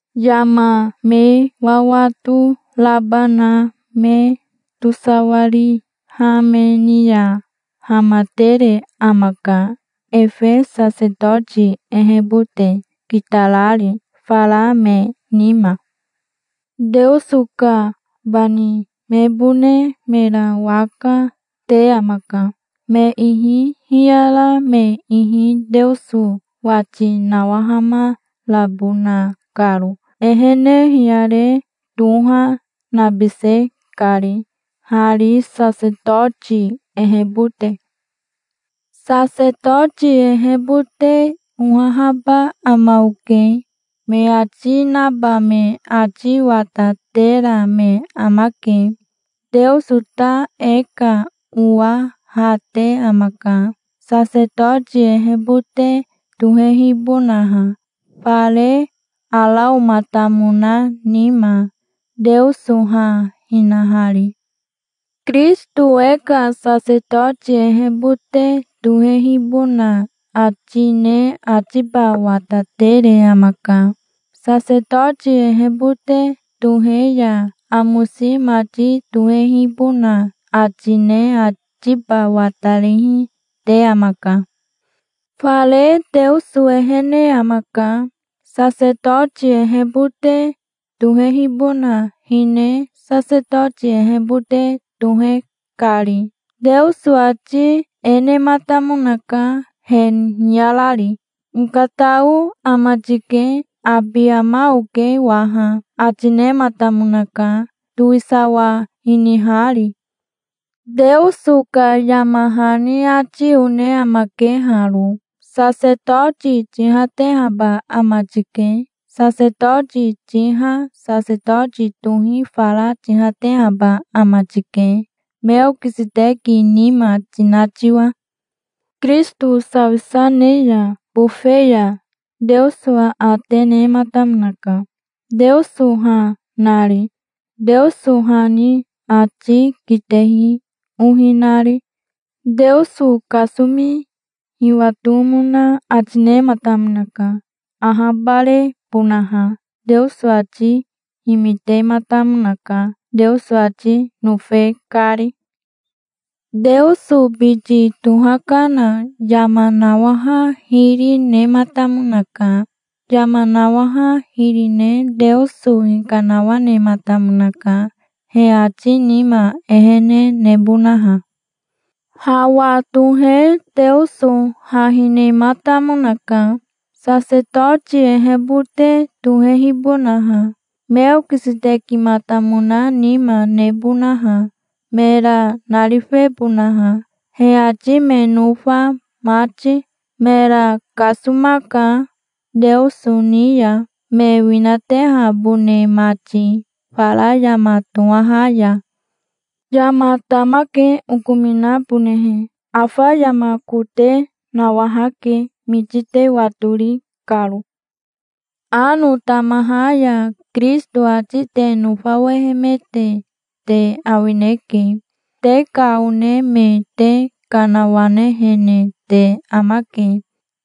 Yama me wawato raba na me tosawariha me ni ya hamatere amaka, efe sasetoti ehebote, kitarari fara me nima. Teoso ka bani mebone mera waka te amaka, me ihi hiyara me ihi Teoso wati nawahamarabona karo, ehene hiyare toha nabise kari, hari, sasetoti ehebote. "Sasetoti ehebote ohahaba ama oke", me ati naba me ati watatera me amake. Teoso ta e ka owa ha te amaka, sasetoti ehebote tohehibonaha, fare Araomatamona nima, Teoso ha hinahari. Kirisito e ka sasetoti ehebote tohehibona ati ne atiba watatere amaka. Sasetoti ehebote tohe ya amosi mati tohehibona ati ne atiba watarihi te amaka. Fare Teoso ehene amaka, sasetoti ehebote tohehibona hine sasetoti ehebote tohe kari. Teoso ati e nematamonaka, he hiyarari: "Okatao ama tike. Abi ama oke waha", ati nematamonaka, towisawa hinihari. Teoso ka yama hani ati one amake haro: "Sasetoti tihatehaba ama tike. Sasetoti tiha sasetoti tohi fara tihatehaba ama tike, Meokiseteki nima tina tiwa". Kirisito sawisa ne ya bofe ya Teoso aate nematamonaka, Teoso ha nari, Teoso ha ni ati kitehi ohi nari. Teoso kasomi hiwatomona ati nematamonaka, ahabarebonaha. Teoso ati himitematamonaka, Teoso ati nofe kari. Teoso biti tohakana yama nawaha hiri, nematamonaka. Yama nawaha hiri ne Teoso hikanawanematamonaka, he ati nima ehene nebonaha. Hawa tohe Teoso ha hinehimatamonaka, sasetoti ehebote tohehibonaha, Meokisetekimatamona nima nebonaha, mera narifebonaha, he ati me nofa mati. Mera kasomaka, Teoso ni ya me winatehabone mati, fara yama tohaha ya. Yama tamake, okominabonehe, afa yama kote. Nawahake, miti te watori karo. Ano tamaha ya Kirisito ati te nofawehemete te awineke. Te ka one me te kanawanehene te amake.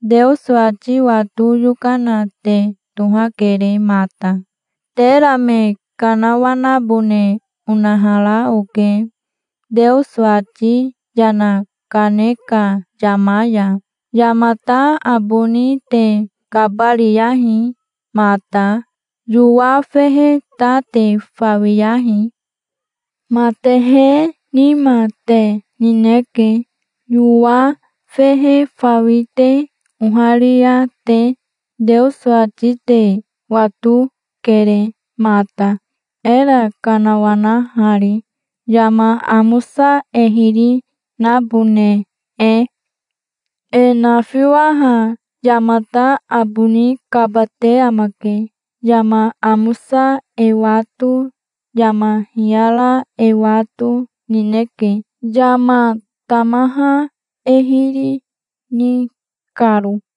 Teoso ati wato yokana te tohakere mata. Tera me kanawanabone onahara oke, Teoso ati yana kane ka yama ya. Yamata aboni te kabariyahi mata. Yowa fehe ta te fawiyahi. Matehe nima te nineke, yowa fehe fawi te oharia te. Teoso ati te watokere mata, era kanawanahari, yama amosa e hiri nabone e. E nafiwaha yamata aboni kabate amake. Yama amosa e wato, yama hiyara e wato nineke, yama tamaha e hiri ni karo.